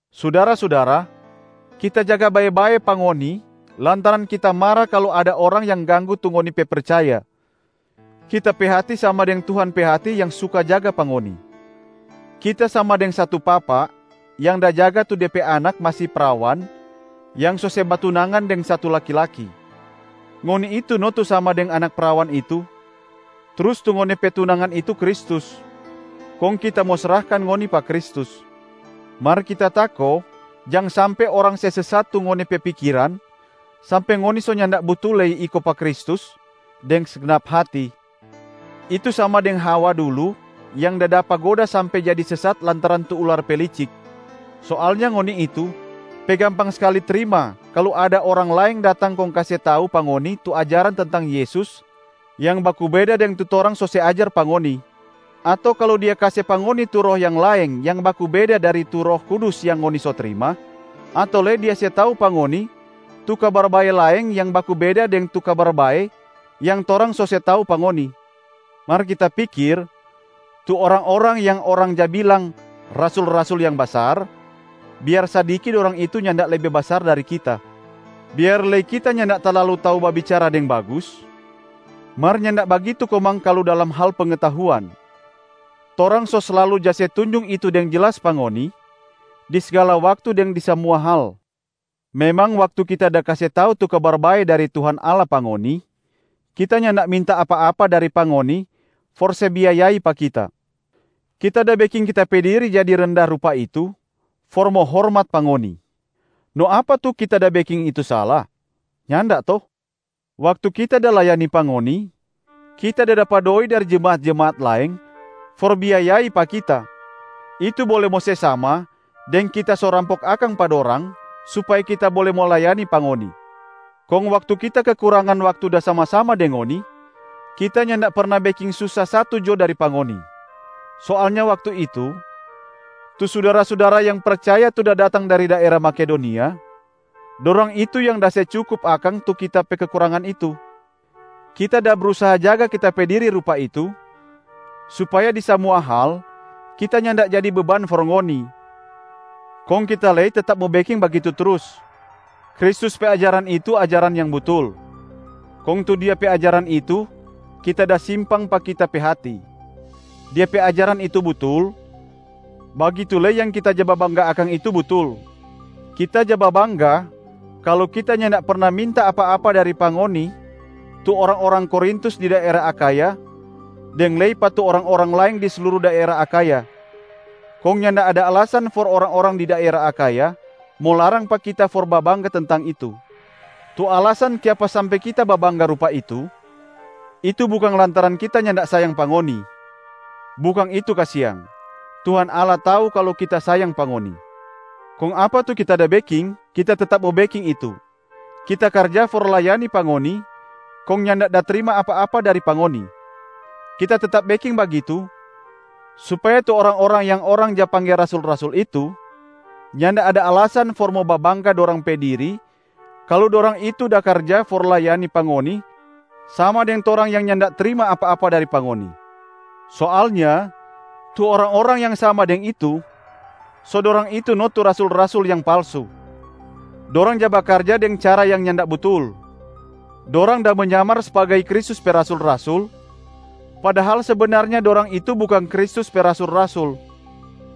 Sudara-sudara, kita jaga bae-bae pa ngoni lantaran kita mara kalu ada orang yang ganggu tu ngoni pe percaya, kita pe hati sama deng Tuhan pe hati yang suka jaga pa ngoni. Kita sama deng satu papa yang da jaga tu de pe anak masi prawan yang so se batunangan deng satu laki-laki. Ngoni itu no tu sama deng anak prawan itu, trus tu ngoni pe tunangan itu Kristus, kong kita mo srahkan ngoni pa Kristus. Mar kita tako jang sampe orang se sesat tu ngoni pe pikiran sampe ngoni so nyanda butul lei iko pa Kristus deng segnap hati. Itu sama deng Hawa dulu yang da dapa goda sampe jadi sesat lantaran tu ular pe licik. Soalnya ngoni itu pe gampang skali trima kalu ada orang laeng datang kong kase tau pa ngoni tu ajaran tentang Yesus yang baku beda deng tu torang so se ajar pa ngoni, ato kalu dia kase pa ngoni tu roh yang laeng yang baku beda dari tu Roh Kudus yang ngoni so trima, ato lei dia se tau pa ngoni tu kabar bae laeng yang baku beda deng tu Kabar Bae yang torang so se tau pa ngoni. Mar kita pikir, tu orang-orang yang orang ja bilang “Rasul-rasul yang basar,” biar sadiki dorang itu nyanda lebe basar dari kita. Biar lei kita nyanda talalu tau babicara deng bagus, mar nyanda bagitu komang kalu dalam hal pengetahuan. Torang so slalu ja se tunjung itu deng jelas pa ngoni di sgala waktu deng di samua hal. Memang waktu kita da kase tau tu Kabar Bae dari Tuhan Allah pa ngoni, kita nyanda minta apa-apa dari pa ngoni for se biayai pa kita. Kita da beking kita pe diri jadi renda rupa itu for mo hormat pa ngoni. No apa tu kita da beking itu sala? Nyanda to? Waktu kita da layani pa ngoni, kita da dapa doi dari jemaat-jemaat laeng for biayai pa kita, itu bole mo se sama deng kita so rampok akang pa dorang supaya kita bole mo layani pa ngoni. Kong waktu kita kekurangan waktu da sama-sama deng ngoni, kita nyanda perna beking susa satu jo dari pa ngoni. Soalnya waktu itu, tu sudara-sudara yang percaya tu da datang dari daera Makedonia, dorang itu yang da se cukup akang tu kita pe kekurangan itu. Kita da brusaha jaga kita pe diri rupa itu supaya di samua hal kita nyanda jadi beban for ngoni, kong kita lei tetap mo beking bagitu trus. Kristus pe ajaran itu ajaran yang butul, kong tu Dia pe ajaran itu kita da simpang pa kita pe hati. Dia pe ajaran itu butul, bagitu lei yang kita ja babangga akang itu butul: kita ja babangga kalu kita nyanda perna minta apa-apa dari pa ngoni tu orang-orang Korintus di daera Akhaya deng lei pa tu orang-orang laeng di sluru daera Akhaya. Kong nyanda ada alasan for orang-orang di daera Akhaya mo larang pa kita for babangga tentang itu. Tu alasan kiapa sampe kita babangga rupa itu, itu bukang lantaran kita nyanda sayang pa ngoni. Bukang itu kasiang, Tuhan Allah tau kalu kita sayang pa ngoni! Kong apa tu kita da beking kita tetap mo beking itu, kita karja for layani pa ngoni kong nyanda da trima apa-apa dari pa ngoni. Kita tetap beking bagitu supaya tu orang-orang yang orang ja pangge rasul-rasul itu, nyanda ada alasan for mo babangga dorang pe diri kalu dorang itu da karja for layani pa ngoni sama deng torang yang nyanda trima apa-apa dari pa ngoni. Soalnya tu orang-orang yang sama deng itu, so dorang itu no tu rasul-rasul yang palsu. Dorang ja bakarja deng cara yang nyanda butul. Dorang da menyamar sbagai Kristus pe rasul-rasul, padahal sebenarnya dorang itu bukang Kristus pe rasul-rasul.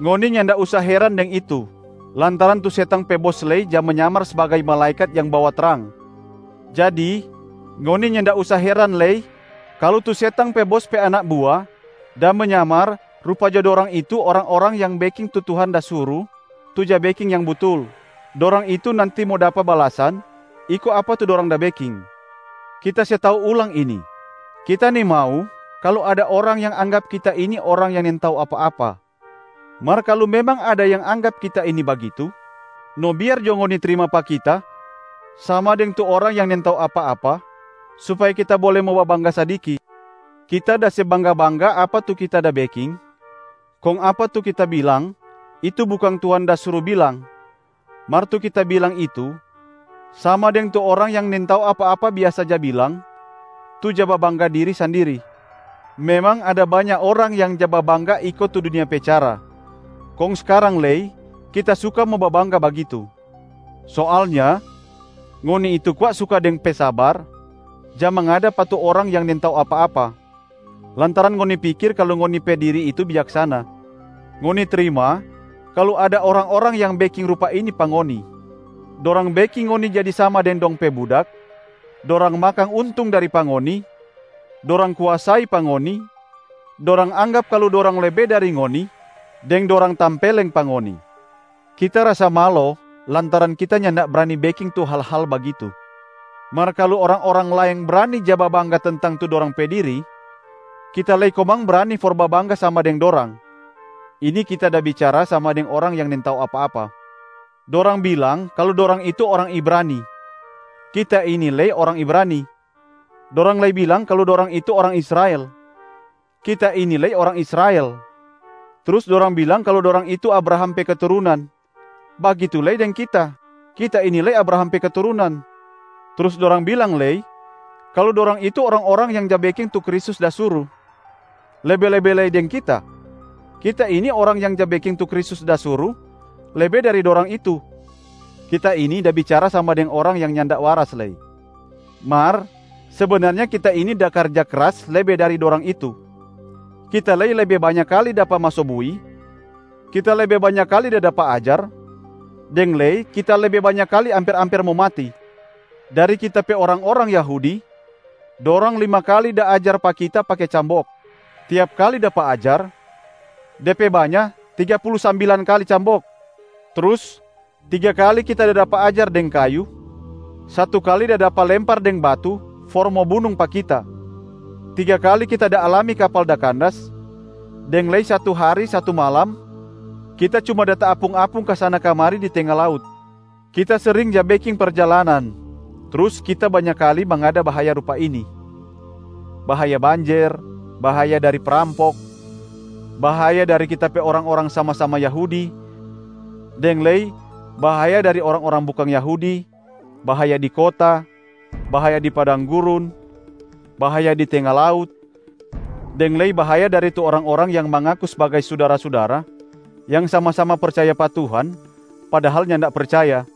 Ngoni nyanda usa heran deng itu, lantaran tu setang pe bos lei ja menyamar sbagai malaekat yang bawa trang. Jadi ngoni nyanda usa heran lei kalu tu setang pe bos pe anak bua da menyamar rupa jo dorang itu orang-orang yang beking tu Tuhan da suru tu ja beking yang butul. Dorang itu nanti mo dapa balasan iko apa tu dorang da beking. Kita se tau ulang ini: kita nimau kalu ada orang yang anggap kita ini orang yang nintau apa-apa. Mar kalu memang ada yang anggap kita ini bagitu, no biar jo ngoni trima pa kita sama deng tu orang yang nintau apa-apa supaya kita bole mo babangga sadiki. Kita da se bangga-bangga apa tu kita da beking, kong apa tu kita bilang itu bukang Tuhan da suru bilang, mar tu kita bilang itu sama deng tu orang yang nintau apa-apa biasa ja bilang tu ja babangga diri sandiri. Memang ada banya orang yang ja babangga iko tu dunia pe cara, kong skarang lei kita suka mo babangga bagitu. Soalnya ngoni itu kwa suka deng pe sabar ja mangada pa tu orang yang nintau apa-apa, lantaran ngoni pikir kalu ngoni pe diri itu bijaksana. Ngoni trima kalu ada orang-orang yang beking rupa ini pa ngoni: dorang beking ngoni jadi sama deng dong pe budak, dorang makang untung dari pa ngoni, dorang kuasai pa ngoni, dorang anggap kalu dorang lebe dari ngoni deng dorang tampeleng pa ngoni. Kita rasa malo lantaran kita nyanda brani beking tu hal-hal bagitu. Mar kalu orang-orang laeng brani ja babangga tentang tu dorang pe diri, kita lei komang brani for babangga sama deng dorang! (Ini kita da bicara sama deng orang yang nintau apa-apa.) Dorang bilang kalu dorang itu orang Ibrani, kita ini lei orang Ibrani. Dorang lei bilang kalu dorang itu orang Israel, kita ini lei orang Israel. Trus dorang bilang kalu dorang itu Abraham pe keturunan, bagitu lei deng kita, kita ini lei Abraham pe keturunan. Trus dorang bilang lei kalu dorang itu orang-orang yang ja beking tu Kristus da suru. Lebe-lebe lei deng kita, kita ini orang yang ja beking tu Kristus da suru lebe dari dorang itu! (Kita ini da bicara sama deng orang yang nyanda waras lei.) Mar sebenarnya kita ini da karja kras lebe dari dorang itu. Kita lei lebe banya kali dapa maso bui, kita lebe banya kali da dapa ajar, deng lei kita lebe banya kali amper-amper mo mati. Dari kita pe orang-orang Yahudi, dorang lima kali da ajar pa kita pake cambok. Tiap kali dapa ajar, de pe banya tiga pulu sambilan kali cambok. Trus tiga kali kita da dapa ajar deng kayu, satu kali da dapa lempar deng batu for mo bunung pa kita, tiga kali kita da alami kapal da kandas, deng lei satu hari satu malam kita cuma da taapung-apung kasana-kamari di tenga laut. Kita sering ja beking perjalanan, trus kita banya kali mangada bahaya rupa ini: bahaya banjer, bahaya dari prampok, bahaya dari kita pe orang-orang sama-sama Yahudi deng lei bahaya dari orang-orang bukang Yahudi, bahaya di kota, bahaya di padang gurun, bahaya di tenga laut, deng lei bahaya dari tu orang-orang yang mangaku sbagai sudara-sudara yang sama-sama percaya pa Tuhan padahal nyanda percaya.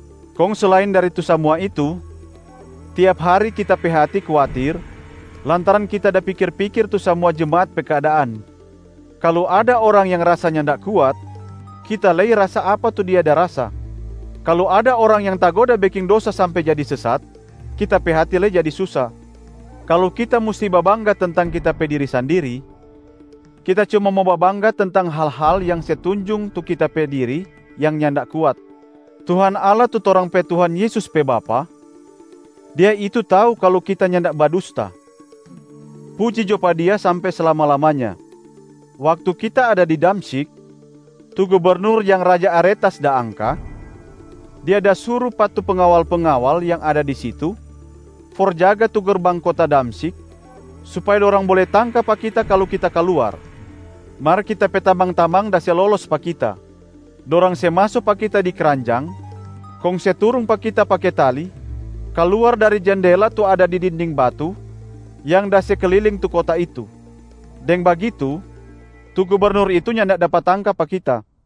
Kong selain dari tu samua itu, tiap hari kita pe hati kuatir lantaran kita da pikir-pikir tu samua jemaat pe keadaan. Kalu ada orang yang rasa nyanda kuat, kita lei rasa apa tu dia da rasa. Kalu ada orang yang tagoda beking dosa sampe jadi sesat, kita pe hati lei jadi susa. Kalu kita musti babangga tentang kita pe diri sandiri, kita cuma mo babangga tentang hal-hal yang se tunjung tu kita pe diri yang nyanda kuat. Tuhan Allah tu torang pe Tuhan Yesus pe Bapa, Dia itu tau kalu kita nyanda badusta. Puji jo pa Dia sampe slama-lamanya. Waktu kita ada di Damsyik, tu gubernur yang raja Aretas da angka, dia da suru pa tu pengawal-pengawal yang ada di situ for jaga tu gerbang kota Damsyik supaya dorang bole tangka pa kita kalu kita kaluar. Mar kita pe tamang-tamang da se lolos pa kita, dorang se maso pa kita di kranjang kong se turung pa kita pake tali kaluar dari jendela tu ada di dinding batu yang da se kliling tu kota itu. Deng bagitu, tu gubernur itu nyanda dapa tangka pa kita.